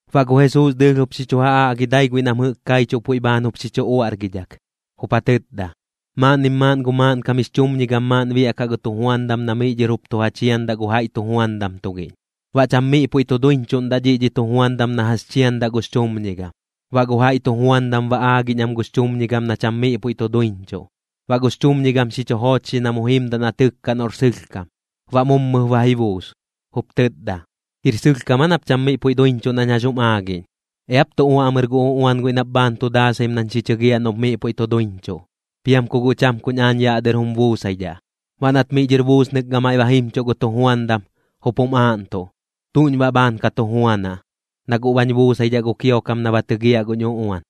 Baꞌ gu Jesuus dɨɨlh jup xi chu ja aꞌgi dai guiꞌ nam jɨꞌk kaichuꞌ puiꞌ bhaan jup xi chu uaꞌrgidhak, jup ja tɨtda: ―Maaꞌnnim maaꞌn gu maaꞌnkam jix chumñigam maaꞌn biaꞌkaꞌ gu tujuandam na miꞌ dhɨr jup tu ja chiandaꞌ gu jaiꞌ tujuandam tugiꞌñ. Baꞌ cham miꞌ puiꞌ tu duiñchuꞌndaꞌ dhiꞌ dhi tujuandam na jax chiandaꞌ gux chumñigam. Baꞌ gu jaiꞌ tujuandam ba aagiꞌñ am gux chumñigam na cham miꞌ puiꞌ tu duiꞌñchuꞌ. Baꞌ gux chumñigam xi chu joochxi na mu jimdaꞌ na tɨkkaꞌ noꞌr sɨlhkam. Baꞌ mummɨp ba ji buus, jup tɨtda: “¿Jir sɨlhkam aa nap cham miꞌ puiꞌ duiñchuꞌ nañ jax jum aagiꞌñ? Eap tu uaꞌmɨr gu uꞌuan guiꞌ nap bhaan tu daasaim nañ xi chɨgiaꞌ noꞌp miꞌ puiꞌ tu duiñchuꞌ, piam ku guꞌ cham kuñ aañ yaꞌ dɨr jum buusaidhaꞌ.” Baꞌ nat miꞌ dhɨr buusnɨk gamaiꞌ ba jimchuꞌ gu tujuandam, jup jum aaꞌntuꞌ: “¿Tuꞌñ baꞌ bhaan ka tu juanaꞌ, na guꞌ bañ buusaidhaꞌ gu kiokam na ba tɨgiaꞌ guñ uꞌuan?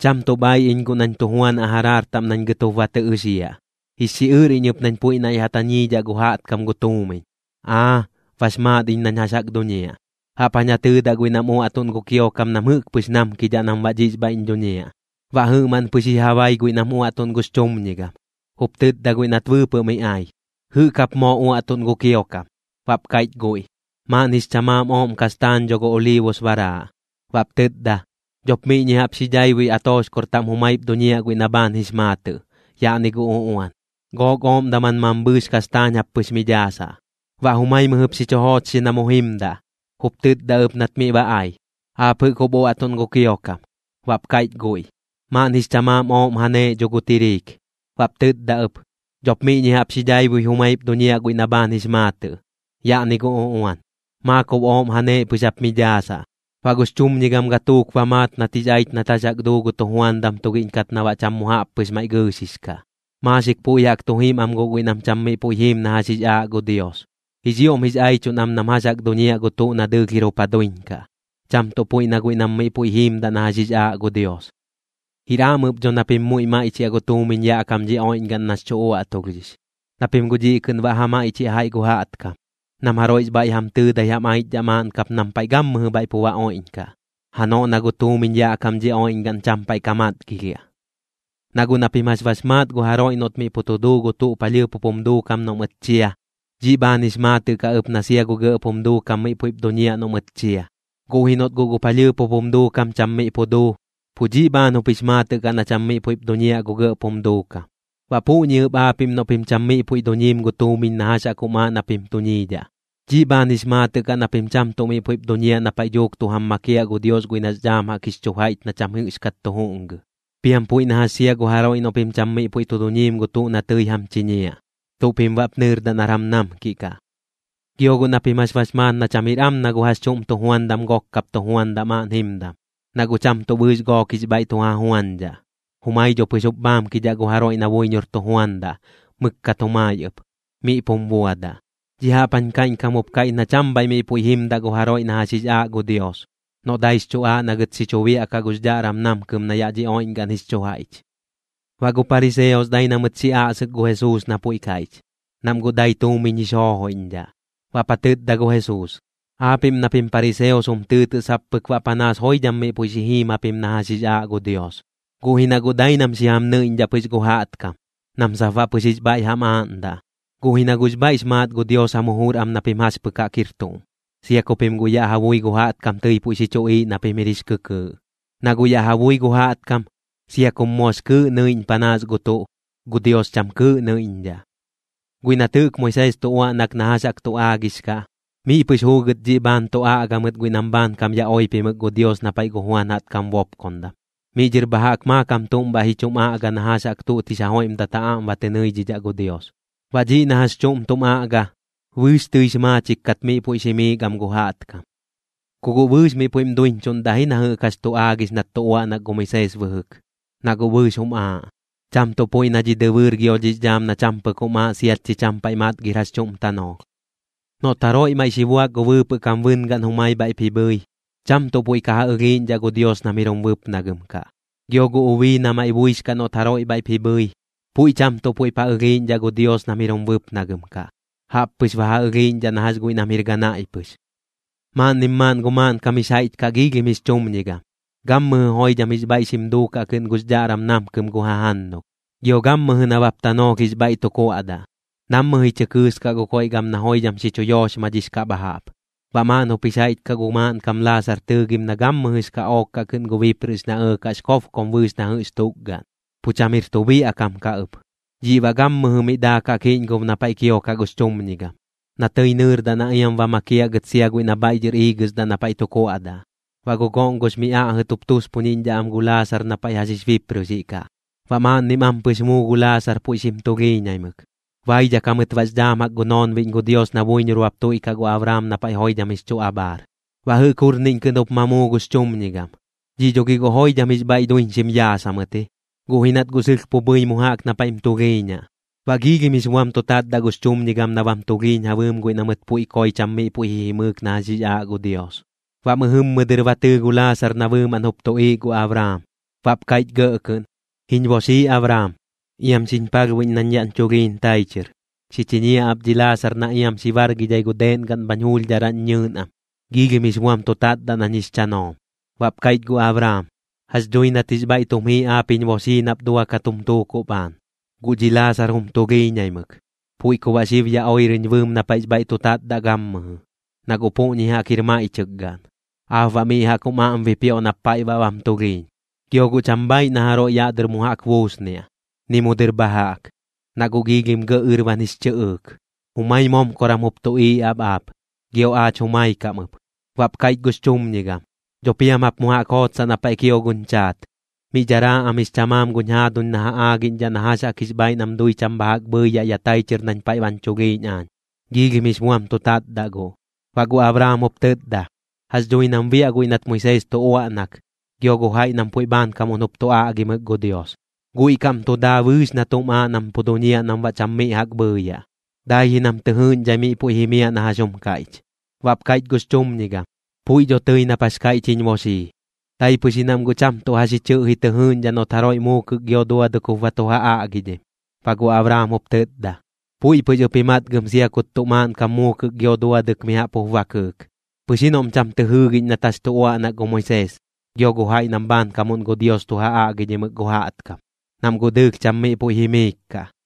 Cham tuꞌ bhaiꞌ iñ guꞌ nañ tu juanaꞌ jaraar taꞌm nañ gɨt jup ba tɨ ɨxiaꞌ. Jix xiꞌɨr iñ ɨp nañ puiꞌ naiꞌ ja tañiidhaꞌ gu jaꞌtkam gu tuumiñ. ¡Aa, bax maat iñ nañ jax jaꞌk duñiaꞌ! Jaꞌp jañ ja tɨɨdaꞌ guiꞌ nam uaꞌtuꞌn gu kiokam nam jɨꞌk pɨx namkidhaꞌ nam baꞌ dhiꞌx bhaiꞌñ dhuñiaꞌ.” Baꞌ jɨꞌmaꞌn pɨx bhaiꞌ ji ja bai guiꞌ nam uaꞌtuꞌn gux chumñigam. Jup tɨtda guiꞌ nat bɨɨpɨꞌ mi ai: “¿Jɨꞌk jap moo uaꞌtuꞌn gu kiokam?” Baꞌp kaiꞌch guiꞌ: “Maaꞌn jix chamaam ooꞌm kastaañ dho gu oliibus baraaꞌ.” Baꞌp tɨtda: “Dhop miꞌñi jaꞌp xi dhaibui atoxkor taꞌm jumaip duñiaꞌ guiꞌ na bhaan jix maatɨꞌ. Yaꞌni gu uꞌuan. Gook ooꞌm daman mambhɨɨx kastaañ jap pɨx mi dhaasaꞌ.” Baꞌ jumai mɨjɨp xi chu joochxi na mu jimdaꞌ, jup tɨtda ɨp nat miꞌ ba ai: “¿Aap jɨꞌk jup uaꞌtuꞌn gu kiokam?” Baꞌp kaiꞌch guiꞌ: “Maaꞌn jix chamaam ooꞌm janeeꞌ dho gu tiriik.” Baꞌp tɨtda ɨp: “Dhop miꞌñi jaꞌp xi dhaibui jumaip duñiaꞌ guiꞌ na bhaan jix maatɨꞌ. Yaꞌni gu uꞌuan. Maakob ooꞌm janeeꞌ pɨx jap mi dhaasaꞌ.” Baꞌ gux chumñigam gatuuk ba maat nat jix aich nat jax jaꞌk duu gu tujuandam tugiꞌñ kat na baꞌ cham mu jaꞌp pɨx maiꞌ gɨɨxix kaꞌ. Maaxik puiꞌ jaꞌk tu jim am guꞌ guiꞌ nam cham miꞌ puiꞌ jiim na jax jix aaꞌ gu Dios, jix ioꞌm jix aichuꞌn am nam jax jaꞌk duñiaꞌ gu tuꞌ na dɨɨlh jir jup ja duiñ kaꞌ, cham tuꞌ puiꞌ na guiꞌ nam miꞌ puiꞌ jiimdaꞌ na jax jix aaꞌ gu Dios. ’Jir am ɨp dho na pim muiꞌ maiꞌchiaꞌ gu tuumiñ yaꞌ kam dhi oiꞌñgaꞌn nax chu uaꞌtulhdhix, na pim guꞌ dhiꞌ kɨꞌn baꞌ ja maiꞌchiaꞌ jaiꞌ gu jaꞌtkam, nam jaroiꞌx bhaiꞌ jam tɨɨdai jam aichdhaꞌ maaꞌn kap nam paiꞌ gammɨjɨ bhaiꞌ pu ba oiꞌñkaꞌ, janoꞌ na gu tuumiñ yaꞌ kam dhi oiꞌñgaꞌn cham paiꞌ ka matgilhiaꞌ. ’Na guꞌ na pim jax bax maat gu jaroiꞌ noꞌt miꞌ pu tu duu gu tuꞌ palhɨɨp jup jum duukam noꞌ mɨt chia, dhiꞌ bhaan jix maatɨꞌ kaꞌ ɨp na sia gu gɇꞌp jum duukam miꞌ puiꞌp duñiaꞌ noꞌ mɨt chia. Guꞌ ji noꞌt guꞌ gu palhɨɨp jup jum duukam cham miꞌ pu duu, pu dhiꞌ bhaan jup jix maatɨꞌ kaꞌ na cham miꞌ puiꞌp duñiaꞌ gu gɇꞌp jum duukam. Baꞌ puꞌñi ɨp aapiꞌm noꞌ pim cham miꞌ puiꞌ duñiim gu tuumiñ na jax jaꞌk jum aaꞌ na pim duñiidhaꞌ, dhiꞌ bhaan jix maatɨꞌ kaꞌ na pim sia cham tuꞌ miꞌ puiꞌp duñiaꞌ na paiꞌ dhuuk tu jam makiaꞌ gu Dios guiꞌ nax dhaam jaꞌk jix chu jaiꞌch na cham jɨꞌxkat tu juꞌngɨ. Piam puiꞌ na jax sia gu jaroiꞌ noꞌ pim cham miꞌ puiꞌ tu duñiim gu tuꞌ na tɨi jam chiñiaꞌ, ¿tuꞌ pim baꞌp nɨɨrdaꞌ nar jam namkiꞌ kaꞌ? ’Gio guꞌ na pim jax bax maat na cham jir am na gu jax chuꞌm tujuandam gok kap tu juandaꞌ maaꞌn jimdam, na guꞌ cham tuꞌ bɨɨx gook jix bhaiꞌ tu ja juañdhaꞌ, jumai dho pɨx jup bhaamkidhaꞌ gu jaroiꞌ na buiñor tu juandaꞌ, mɨkkat jumai ɨp, miꞌ pum buadaꞌ. Dhiꞌ jaꞌp jañ kaiꞌñkam jup kaiꞌch na cham bhaiꞌ miꞌ puiꞌ jimdaꞌ gu jaroiꞌ na jax jix aaꞌ gu Dios, noꞌ daix chu aaꞌ na gɨt xi chu biaꞌkaꞌ gux dhaꞌram namkɨm na yaꞌ dhi oiꞌñgaꞌn jix chu jaiꞌch. Baꞌ gu pariseos dai na mɨt xi aꞌsɨk gu Jesuus na puiꞌ kaiꞌch, nam guꞌ dai tuumiñ jix joojoiꞌñdhaꞌ. Baꞌp ja tɨtda gu Jesuus: ―Aapiꞌm na pim pariseos jum tɨɨtɨꞌ sap pɨk baꞌ panaas joidham miꞌ puiꞌ xi jiim japim na jax jix aaꞌ Dios, guꞌ ji na guꞌ dai nam xi jam nɨiꞌñdhaꞌ pɨx gu jaꞌtkam, nam sap baꞌ pɨx jix bhaiꞌ jam aaꞌndaꞌ. Guꞌ ji na guꞌx bhaiꞌx maat gu Dios jam jujur am na pim jax pɨk jaꞌk jir tuꞌm, sia ku pim guꞌ yaꞌ ja bui gu jaꞌtkam tɨi puiꞌ xi chuꞌiiꞌ na pim jir kɨkɨɨꞌ. Na guꞌ yaꞌ ja bui gu jaꞌtkam, sia kum moox kɨɨꞌ nɨiꞌñ panaas gu tuꞌ, gu Dios cham kɨɨꞌ nɨiꞌñdhaꞌ. ’Guiꞌ nat jɨꞌk Moisees tu uaꞌnak na jax jaꞌk tu aagix kaꞌ, miꞌ pɨx juugɨt dhiꞌ bhaan tu aꞌga mɨt guiꞌ nam bhaankam ya oipimɨk gu Dios na paiꞌ gu Juan jaꞌtkam bopkondam. Miꞌ dhɨr bha jaꞌk maakam tuꞌm bhaiꞌ ji chum aꞌga na jax jaꞌk tuꞌt jix joiꞌmdat ja aꞌm ba tɨ nɨidhidhaꞌ gu Dios. Baꞌ dhiꞌ na jax chuꞌm tum aꞌga, bɨɨx tɨix maachik kat miꞌ puiꞌx jimiik am gu jaꞌtkam. ’Ku guꞌ bɨɨx miꞌ puiꞌm duiñchuꞌndaꞌ ji na jɨꞌk jax tu aagix nat tu uaꞌnak gu Moisees bɨjɨk, na guꞌ bɨɨx jum aaꞌ, cham tuꞌ puiꞌ na dhi dɨbɨɨr gio dhix dhaam na cham pɨk jum aaꞌ siat chi cham paiꞌ matgir jax chuꞌm tanoolh. ’Noꞌt jaroiꞌ maiꞌ xi buak gu bɨɨpɨꞌ kam bɨngaꞌn jumai bhaiꞌp ji bhɨi, cham tuꞌ puiꞌ ka ja ɨlhiiꞌñdhaꞌ gu Dios nam jir jum bɨpnagɨm kaꞌ. Gio gu ubii na maiꞌ buix kaꞌ noꞌt jaroiꞌ bhaiꞌp ji bhɨi, puiꞌ cham tuꞌ puiꞌp ja ɨlhiiꞌñdhaꞌ gu Dios nam jir jum bɨpnagɨm kaꞌ. Jaꞌp pɨx ba ja ɨlhiiꞌñdhaꞌ na jax guiꞌ nam jir ganaiꞌ pɨx. ’Maaꞌnnim maaꞌn gu maaꞌnkam jix jaiꞌch kaꞌ giilhim jix chumñigam. Gammɨjɨ joidham jix bhaiꞌ xim duukaꞌ kɨꞌn gux dhaꞌram namkɨm gu jajannulh, gio gammɨjɨ nabap tanoolh jix bhaiꞌ tu kuaꞌdaꞌ. Nammɨ ji chɨ kɨɨskaꞌ gu koiꞌ gam na joidham xi chu yooxmadhix kaꞌ bha jaꞌp. Baꞌ maaꞌn jup jix jaiꞌch kaꞌ gu maaꞌnkam Laasar tɨɨgim na gammɨjɨx kaꞌook kaꞌ kɨꞌn gu bipprɨꞌx na ɇɇkaꞌx kobkom bɨɨx na jɨꞌx tukgaꞌn. Pu cham jir tuꞌ biaꞌ kam kaꞌ ɨp. Dhiꞌ baꞌ gammɨjɨ miꞌ daakaꞌ kiꞌñgob na paiꞌ kiokaꞌ gux chumñigam, na tɨi nɨɨrdaꞌ na iam ba makiaꞌ gɨt sia guiꞌ na bhaiꞌ dhɨr iigɨsdaꞌ na paiꞌ tu kuaꞌdaꞌ. Baꞌ gu goꞌngox mi aꞌjɨt jup tuspuniꞌñdhaꞌ am gu Laasar na paiꞌ jax jix bipprɨꞌxiꞌ kaꞌ. Baꞌ maaꞌnnim ampɨx muu gu Laasar puiꞌ xim tulhiiñaimɨk, baidhak jamɨt baꞌx dhaam jaꞌk gu noonbiꞌñ gu Dios na buiñor bap tuiꞌkaꞌ gu Abraam na paiꞌ joidham jix chu abhaar. Baꞌ jɨꞌk jurniꞌñ kɨꞌn jup ma muu gux chumñigam, dhiꞌ dho gi guꞌ joidham jix bhaiꞌ duiñxim yaas jamɨt ji, guꞌ ji nat guꞌ pu jii mu jaꞌk na paiꞌm tulhiiñaꞌ. Baꞌ giilhim jix buam tu tatdaꞌ gux chumñigam na bam tulhiiñ ja bɨɨm guiꞌ na mɨt puiꞌ koi cham miꞌ puiꞌ ji jimɨɨk na jax jix aaꞌ gu Dios. Baꞌ mɨjɨmmɨ dɨr ba tɨɨ gu Laasar na bɨɨmaꞌn jup tuꞌiiꞌ gu Abraam. Baꞌp kaiꞌch gɇꞌ kɨꞌn: “Jiñ boxii Abraam, iam xiñ palhbuiꞌñ nañ yaꞌñ chulhiiñ tai chɨr. Xi chiñiaꞌ ap dhi Laasar na iam xi bargidhai gu deeꞌn gaꞌn bhañ juulhdharaꞌñ ñɨɨn am. Giilhim jix buam tu tatdaꞌ nañ jix chanoom.” Baꞌp kaiꞌch gu Abraam: “Jax dhui nat jix bhaiꞌ tum jii aap jiñ boxii nap duakat jum tuukuꞌ bhaan, guꞌ dhi Laasar jum tulhiiñaimɨk. Puiꞌ ku baꞌ xib ya oirɨñ bɨɨm na paiꞌx bhaiꞌ tu tatdaꞌ gammɨjɨ, na guꞌ puꞌñi jaꞌk jir maiꞌchɨk gaꞌn. Aap baꞌ miꞌ jaꞌk jum aꞌm bipioꞌ nap paiꞌ baꞌ bam tulhiiñ. Gio guꞌ cham bhaaiꞌ na jaroiꞌ yaꞌ dɨr mu jaꞌk buusniaꞌ, ni mu dɨr bha jaꞌk, na guꞌ giilhim gɇꞌ ɨrban jix chɨꞌɨɨk. Jumai momkoram jup tuꞌiiꞌ ap aap, gio aach jumai kaꞌm ɨp.” Baꞌp kaiꞌch gux chumñigam: “Dho piam jap mu jaꞌk jootsaꞌ na paiꞌ kio guñ chaat. Miꞌ dharaa am jix chamaam guñ jaaduñ na ja aagiꞌñdhaꞌ na jax jaꞌk jix bhaaiꞌ nam dui cham bha jaꞌk bhɨɨyaꞌ ya tai chɨr nañ paiꞌ bañ chulhiiñ aañ. Giilhim jix buam tu tatdaꞌ guꞌ.” Baꞌ gu Abraam jup tɨtda: “Jax dhui nam biaꞌ guiꞌ nat Moisees tu uaꞌnak, gio gu jaiꞌ nam puiꞌ bhaankamuꞌn jup tu aꞌgimɨk gu Dios. Guiꞌ kaꞌm tu daa bɨɨx na tuꞌm aaꞌ nam pu duñiaꞌ nam baꞌ cham miꞌ jaꞌk bhɨɨyaꞌ. Dai ji nam tɨ jɨɨꞌñdhai miꞌ puiꞌ jimiaꞌ na jax jum kaiꞌch.” Baꞌp kaiꞌch gux chumñigam: “Puiꞌ dho tɨi nap jax kaiꞌch jiñ boxii, dai pɨx ji nam guꞌ cham tuꞌ jax ji chɨꞌji tɨ jɨɨꞌñdhaꞌ noꞌt jaroiꞌ muukɨk gio duadɨk jup ba tu ja aꞌgidhim.” Baꞌ gu Abraam jup tɨtda: “Puiꞌ pɨx ɨp ji matgɨm sia kut tuꞌ maaꞌnkam muukɨk gio duadɨk mi jaꞌp jup ba kɨɨk, pɨx ji noꞌm cham tɨ jɨɨgiꞌñ nat jax tu uaꞌnak gu Moisees, gio gu jaiꞌ nam bhaankamuꞌn gu Dios tu ja aꞌgidhimɨk gu jaꞌtkam, nam guꞌ dɨɨlh cham miꞌ puiꞌ jimiik kaꞌ.”